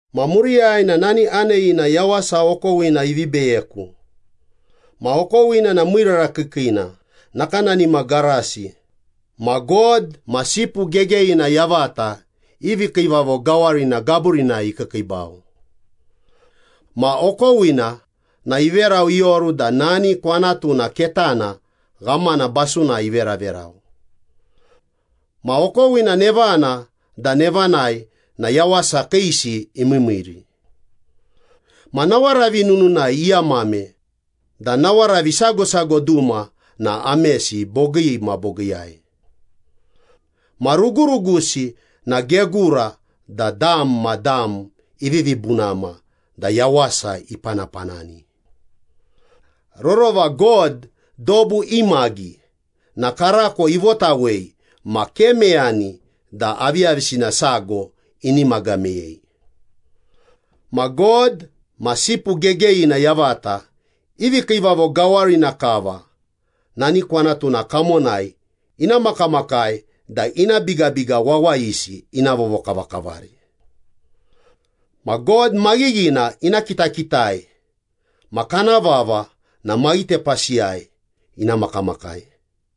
Ma muriyai na nani aneyina yawasa okowina ivi beyeku. Ma okowina na miirara kiikiina, nakanani ma garasi, ma God ma Sipu Gegeyina yavata i vikiivavo gawarina gaburinai ikiikiibau. Ma okowina na iverau ioru da nani kwanatuna ketana ghamana basunai iveraverau. Ma okowina nevana da nevanai na yawasa kiisi imiimiiri. Ma nawaravi nununai iamame da nawaravi sago sago duma na amesi bogii ma bogiiyai. Ma rugurugusi na gegura da dam ma dam ivivi bunama da yawasa ipanapanani. Rorova God dobu imagi na karako ivotawei ma ke meyani da aviyavisina sago inimaga meyei. Ma God ma Sipu Gegeyina yavata i vikiivavo gawarina kava nani kwanatuna kamonai ina makamakai da ina bigabiga wawayisi ina vovokavakavari. Ma God maghighina ina kitakitai ma kana vava na maghitepasiyai ina makamakai.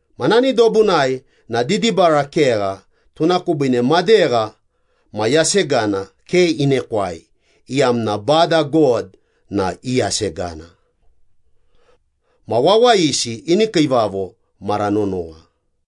Ma nani dobunai na didibara kegha tuna kubiine madegha ma yasegana ke inekwai, iyamna Bada God na i yasegana. Ma wawayisi ini kiivavo mara nonowa.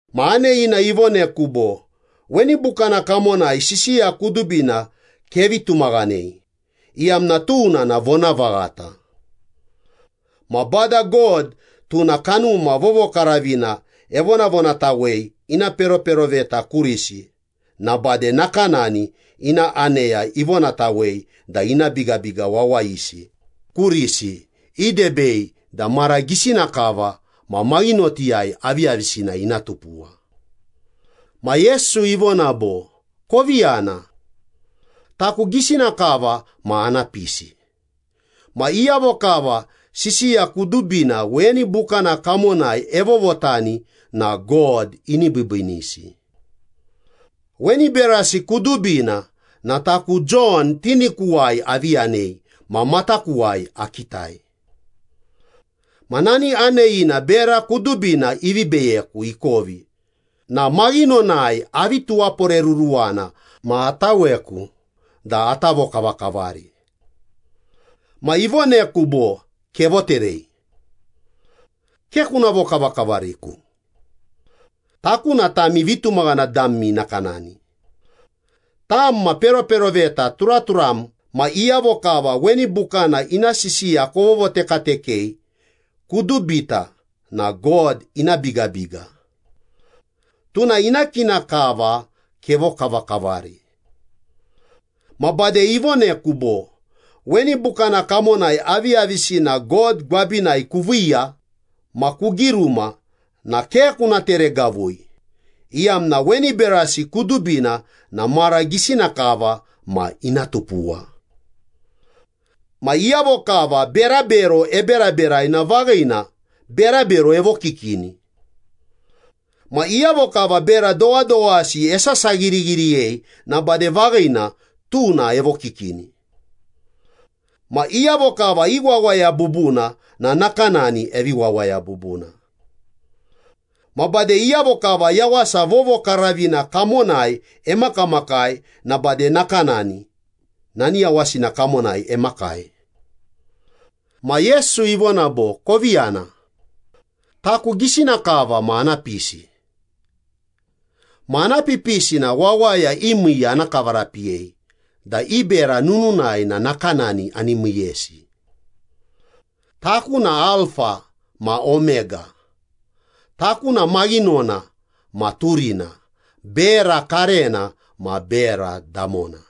Ma aneyina ivoneku bo, “Weni bukana kamonai sisiya kudubina kevi tumaghanei, iyamna tuna na vonavaghata. Ma Bada God tuna Kanuma Vovokaravina evonavonatawei ina peroperoveta kurisi na bade nakanani ina aneya ivonatawei da ina bigabiga wawayisi kurisi idebei da mara gisina kava ma maghinotiyai aviyavisina ina tupuwa.” Ma Yesu ivona bo, “Kovi yana. Taku gisina kava ma ana pisi. Ma iyavo kava sisiya kudubina weni bukana kamonai evovotani na God ini biibiinisi.” Weni berasi kudubina na taku Jon tinikuwai avi yanei ma matakuwai akitai. Ma nani aneyina bera kudubina ivi beyeku ikovi na maghinonai avi tuwaporeruruwana ma ataweku da ata vokavakavari. Ma ivoneku bo, “Kevoterei. Ke kuna vokavakavariku.” “Taku na tami vitumaghana dami nakanani. Tam ma peroperoveta turaturam ma iyavo kava weni bukana ina sisiya kovovotekatekei, kudubita na God ina bigabiga. Tuna ina kina kava kevokavakavari.” Ma bade ivoneku bo, “Weni bukana kamonai aviyavisina God gwabinai kuviiya ma kugiruma na ke kuna teregavui, iyamna weni berasi kudubina na mara gisina kava ma ina tupuwa. Ma iyavo kava berabero eberaberai na vaghina, berabero evokikini. Ma iyavo kava bera dowadowasi esasaghirighiriyei na bade vaghina, tuna evokikini. Ma iyavo kava iwawaya bubuna na nakanani evi wawaya bubuna. Ma bade iyavo kava yawasa vovokaravina kamonai emakamakai na bade nakanani nani yawasina kamonai emakai.” Ma Yesu ivona bo, “Kovi yana. Taku gisina kava ma ana pisi. Ma ana pipisi na wawaya i miiya ana kavarapiyei da i bera nununai na nakanani ani miiyesi. Taku na Alfa ma Omega, taku na maghinona ma turina, bera karena ma bera damona.”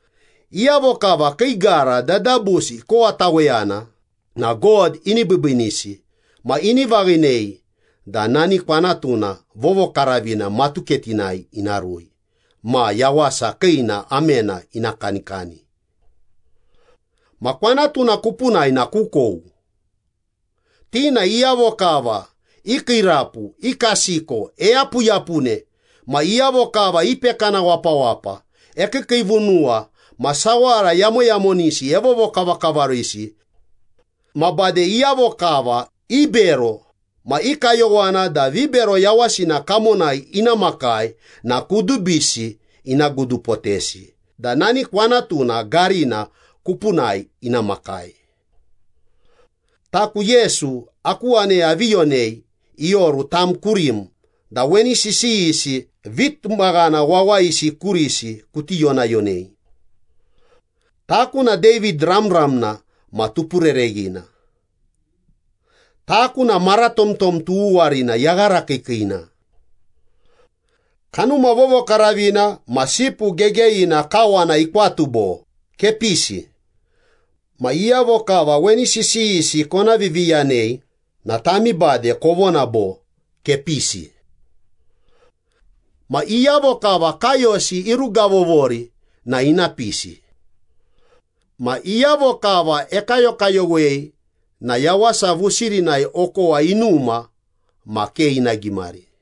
Iyavo kava kii gara dadabusi ikowataweyana na God ini biibiinisi ma ini vaghinei da nani kwanatuna vovokaravina matuketinai ina rui ma yawasa kiina amena ina kanikani. Ma kwanatuna kupunai na kukou. Ti na iyavo kava ikiirapu, ikasiko, eyapuyapune, ma iyavo kava ipekana wapawapa, ekiikiivunuwa, ma sawara yamoyamonisi evovokavakavarisi. Ma bade iyavo kava ibero ma i kayowana da vibero yawasina kamonai ina makai, na kudubisi ina gudupotesi da nani kwanatuna garina kupunai ina makai. “Taku Yesu aku aneya avi yonei ioru tam kurim da weni sisiyisi vitumaghana wawayisi kurisi kuti yonayonei. Taku na David ramramna ma tupurereghina. Taku na maratomtom tughuwarina, yaghara kiikiina.” Kanuma Vovokaravina ma Sipu Gegeyina kawana ikwatu bo, “Kepisi.” Ma iyavo kava weni sisiyisi kona viviyanei na tami bade kovona bo, “Kepisi.” Ma iyavo kava kaiyosi irugavovori na ina pisi. Ma iyavo kava ekayokayowei na yawasa vusirinai okowa inuma ma ke ina gimari.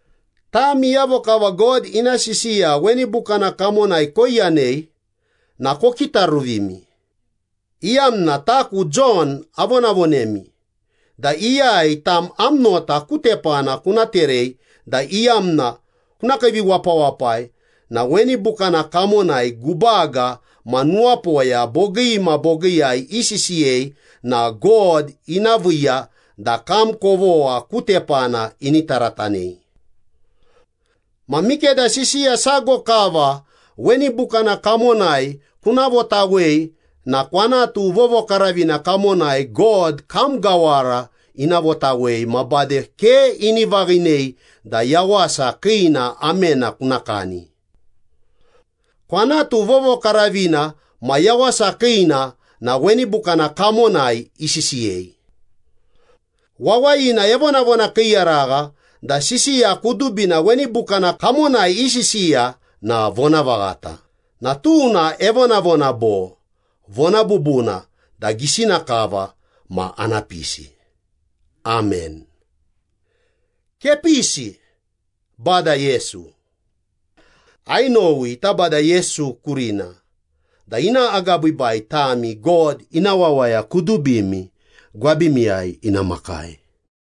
Tami iyavo kava God ina sisiya weni bukana kamonai koiyanei na kokitaruvimi, iyamna taku Jon avonavonemi da iyai tam am nota ku tepana kuna terei da iyamna kuna kiiviwapawapai na weni bukana kamonai gubaga ma nuwapoya bogii ma bogiiyai isisiyei na God ina viiya da kam kovogha ku tepana ini taratanei. Ma mikeda sisiya sago kava weni bukana kamonai kuna votawei na kwanatu vovokaravina kamonai God kam gawara ina votawei ma bade ke ini vaghinei da yawasa kiina amena kuna kani. Kwanatu vovokaravina ma yawasa kiina na weni bukana kamonai isisiyei. Wawayina evonavona kiiyaragha da sisiya kudubina weni bukana kamonai isisiya na vonavaghata, na tuna evonavona bo, “Vona bubuna da gisina kava ma ana pisi.” Amen. Kepisi, Bada Yesu. Ainowi Bada Yesu kurina da ina agabiibai tami God ina wawaya kudubimi gwabimiyai ina makai.